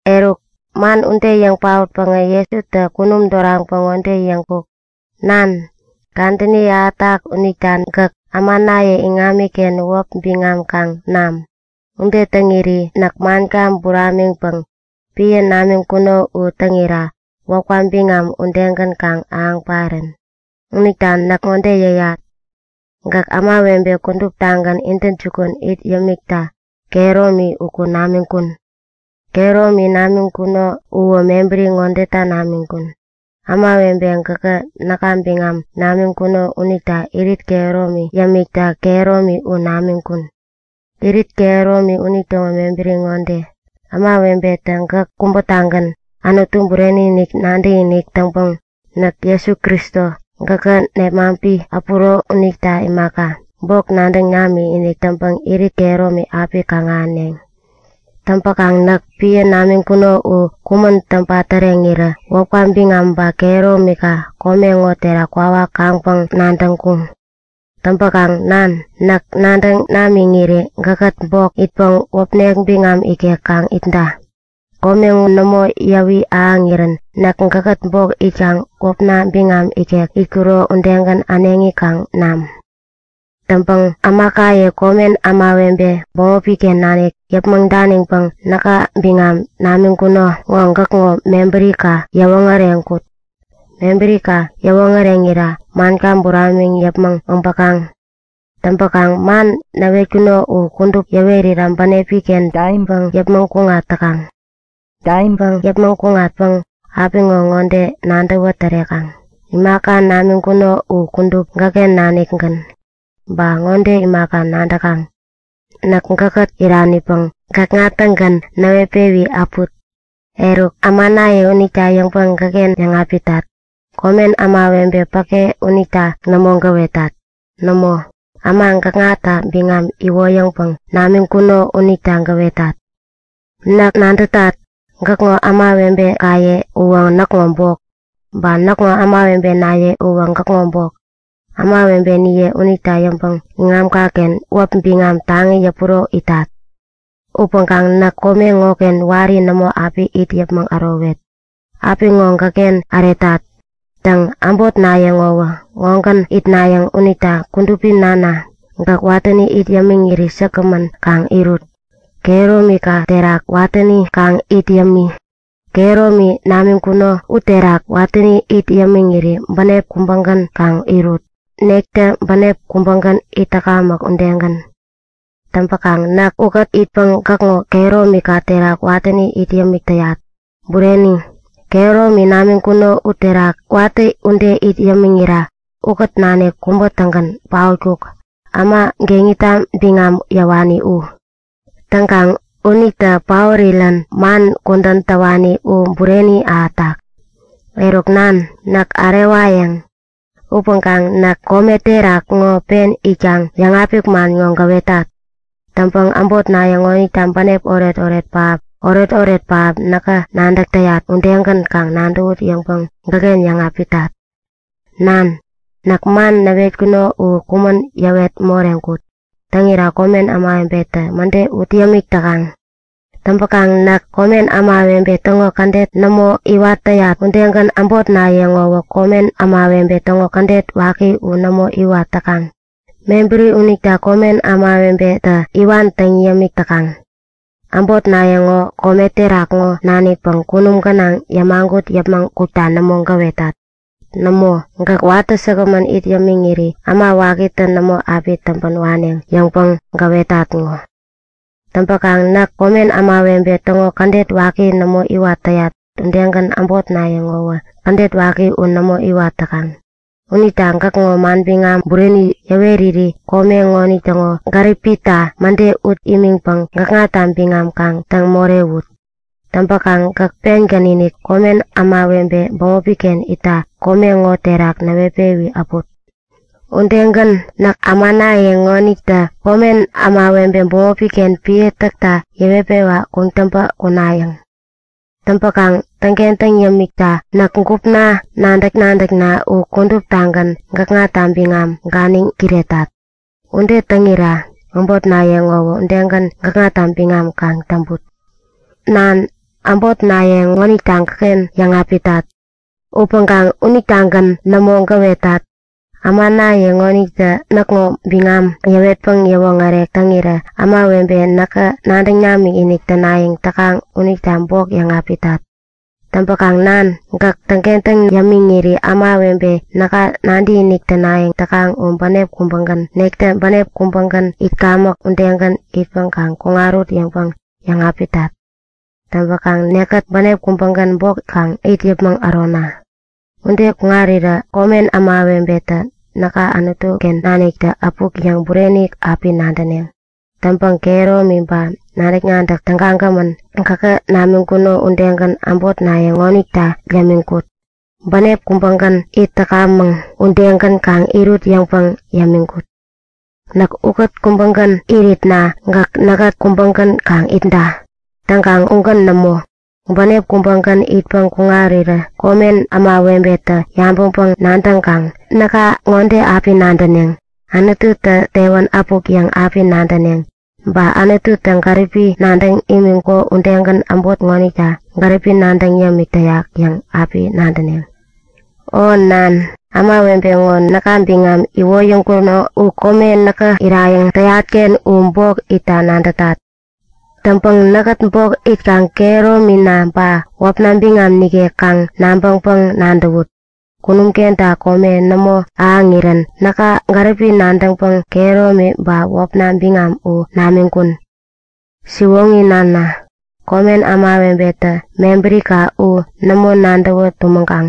Eruk, man ude yäŋ paotpäŋä Jesutä kunum doraŋpäŋ ŋode yäŋkuk; Nan, kadäni ahätak unita gäk ämanaye iŋamiken wäp biŋam kaŋ nam. Ude täŋiri näk manka buramiŋpäŋ epän namiŋkuno u täŋira wäpka biŋam udegän kaŋ ahäŋ parän. Unita näk ŋode yäyat; Gäk ämawebe kuduptagän intäjukun it yämikta kehäromi uku namiŋkun. Kehäromi namiŋkuno uwä mebäri ŋodeta namiŋkun; Ämawebe gäkä näka biŋam namiŋkuno unita irit kehäromi yämikta kehäromi u namiŋkun. Irit kehäromi unitäŋo mebäri ŋode; Ämawebetä gäk kubätagän Anutu bureni-inik nadäkinik täŋpäŋ näk Jesu Kristo gäkä nepmaŋpi äpuro unita imaka, bok nadäŋ namikinik täŋpäŋ irit kehäromi api kaŋ-ahäneŋ. Täŋpäkaŋ näk epän namiŋkuno u kumän täŋpa täreŋirä wäpka biŋam ba kehäromika kome ŋo terak kwawak kaŋpäŋ nadäŋkuŋ. Täŋpäkaŋ Nan, näk nadäŋ namiŋiri gäkkät bok itpäŋ wäpnek biŋam ikek kaŋ itda. Kome ŋo nämo yäwi ahäŋirän näk gäkkät bok itkaŋ wäpna biŋam ikek itkuro udegän äneŋi kaŋ nam. Täŋpäŋ ämakaye komen ämawebe bämopi-ken nanik yäpmäŋ daniŋpäŋ näka biŋam namiŋkuno ŋo gäkŋo mebärika yäwoŋäreŋkut. Mebärika yäwoŋäreŋira manka buramiŋ yäpmäŋ äbäkaŋ. Täŋpäkaŋ man näwetkuno u kudup yäwerira bänepi-ken daiŋpäŋ yäpmäŋ kuŋat täkaŋ. Daiŋpäŋ yäpmäŋ kuŋatpäŋ apiŋo ŋode nadäwä tärekaŋ; Imaka namiŋkuno u kudup gäkken nanikgän. Ba ŋode imaka nadäkaŋ; Näk gäkkät iranipäŋ gäkŋa-tägän näwetpewi äput. Eruk, ämanaye unita yäŋpäŋ gäkken yäŋapitat. Komen ämawebe päke unita nämo gäwetat. Nämo, äma gäkŋata biŋam iwoyäŋpäŋ namiŋkuno unita gäwetat. Näk nadätat, gäkŋo ämawebekaye uwä näkŋo bok. Ba näkŋo ämawebenaye uwä gäkŋo bok. Ämawebeniye unita yäŋpäŋ iŋamka-ken wäp biŋam taŋi yäpuro itat. Upäŋkaŋ näk kome ŋoken wari nämo api it yäpmäŋ ärowet. Apiŋo gäkken äretat. Täŋ, äbotnaye ŋowä ŋogän itnayäŋ unita Kudupi Nana, gäk watäni it yämiŋiri säkgämän kaŋ irut. Kehäromika terak watäni kaŋ it yämi. Kehäromi namiŋkuno uterak watäni it yämiŋiri bänep kubägän kaŋ irut, nektä bänep kubägän itkamäk udegän. Täŋpäkaŋ näk ukät itpäŋ gäkŋo kehäromika terak watäni it yämik täyat. Bureni, kehäromi namiŋkuno uterak watä ude it yämiŋira ukät nanik kubä-tägän paotkuk, äma geŋita biŋam yäwani u. Täŋkaŋ unitä paorirän man kudän täwani u bureni ahätak. Eruk nan, näk ärewayäŋ. Upäŋkaŋ näk kome terak ŋo pen itkaŋ yäŋapik man ŋo gäwetat. Täŋpäŋ äbotnaye ŋonitä bänep oretoret pähap, oretoret pähap näkä nadäk täyat udegän kaŋ nadäwut yäŋpäŋ gäkken yäŋapitat. Nan, näk man näwetkuno u kumän yäwet moreŋkut. Täŋira komen ämawebetä mäde ut yämik täkaŋ. Täŋpäkaŋ näk komen ämawebe täŋo kädet nämo iwat täyat udegän äbotnaye ŋowä komen ämawebe täŋo kädet waki u nämo iwat täkaŋ. Mebäri unita komen ämawebetä iwan täŋ yämik täkaŋ. Äbotnaye ŋo kome terak ŋo nanikpäŋ kunum gänaŋ yämagut yäpmäŋ kukta nämo gäwetat. Nämo, gäk watä säkgämän it yämiŋiri Äma Wakitä nämo api täŋpän waneŋ yäŋpäŋ gäwetat ŋo. Täŋpäkaŋ näk komen ämawebe täŋo kädet waki nämo iwat täyat udegän äbotnaye ŋowä kädet waki u nämo iwat täkaŋ. Unita gäkŋo manbiŋam bureni yäweriri kome ŋonitäŋo gäripita mäde ut imiŋpäŋ gäkŋata biŋam kaŋ täŋ morewut. Täŋpäkaŋ gäk pengän-inik komen ämawebe bämopi-ken itta kome ŋo terak näwetpewi äput. Udegän, näk ämanaye ŋonitä komen ämawebe bämopi-ken epän täkta yäwetpewa kuŋtäŋpä kunayäŋ. Täŋpäkaŋ täŋkentäŋ yämikta näk gupna nadäk-nadäkna u kuduptagän gäkŋata biŋam ganiŋ kiretat. Ude täŋira äbotnaye ŋowä udegän man burenita biŋamgän kaŋ täŋput. Nan, äbotnaye ŋonita gäkken yäŋapitat. Upäŋkaŋ unitagän nämo gäwetat. Ämanaye ŋonitä näkŋo biŋam yäwetpäŋ yäwoŋärek täŋirä ämawebe näka nadäŋ namikinik tänayäŋ täkaŋ unita bok yäŋapitat. Täŋpäkaŋ nan, gäk täŋkentäŋ yämiŋiri ämawebe näka nadäkinik tänayäŋ täkaŋ u bänep kubägän, nektä bänep kubägän itkamäk udegän itpäŋ kaŋ kuŋarut yäŋpäŋ yäŋapitat. Täŋpäŋ nekkät bänep kubägän bok kaŋ it yäpmäŋ ärona. Ude kuŋarirä komen ämawebetä näka Anutu-ken naniktä äpuk yäŋ bureni api nadäneŋ. Täŋpäŋ kehäromi ba nadäk-nadäk tägagämän gäkä namiŋkuno udegän äbotnaye ŋonita yämiŋkut. Bänep kubägän it täkamäk, udegän kaŋ irut yäŋpäŋ yämiŋkut. Näk ukät kubägän iritna gäk näkkät kubägän kaŋ itda. Täŋkaŋ ugän nämo. Bänep kubägän itpäŋ kuŋarirä komen ämawebetä yabäŋpäŋ-nadäŋkaŋ näka ŋode api nadäneŋ; Anututä tewän äpuk yäŋ api nadäneŋ. Ba Anututä gäripi nadäŋ imiŋkuko udegän äbot ŋonita gäripi nadäŋ yämik täyak yäŋ api nadäneŋ. O nan, ämawebe ŋo näka biŋam iwoyäŋkuno u kome näkä irayäŋ täyat-ken u bok itta nadätat. Täŋpäŋ näkkät bok itkaŋ kehäromina ba wäpna biŋam nikek kaŋ nabäŋpäŋ-nadäwut. Kunum kenta kome nämo ahäŋirän näka gäripi nadäŋpäŋ kehäromi ba wäpna biŋam u namiŋkun. Siwoŋi nana, komen ämawebetä mebärika u nämo nadäwä tumäŋkaŋ.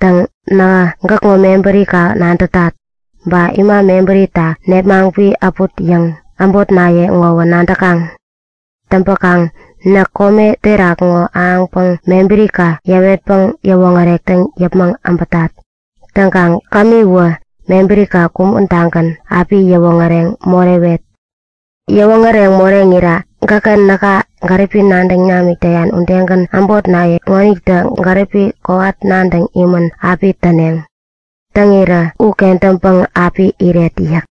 Täŋ, nähä gäkŋo mebärika nadätat. Ba ima mebärita nepmaŋpi äput yäŋ, äbotnaye ŋowä nadäkaŋ. Täŋpäkaŋ näk kome terak ŋo äpäŋpäŋ mebärika yäwetpäŋ yäwoŋärek täŋ yäpmäŋ äbätat. Täŋkaŋ kämiwä, mebärika kumän-tagän api yäwoŋäreŋ morewet. Yäwoŋäreŋ moreŋira gäkä näka gäripi nadäŋ namik täyan udegän äbotnaye ŋonitä gäripi kowat nadäŋ imän api täneŋ. Täŋirä u kentäŋpäŋ api iret yäk.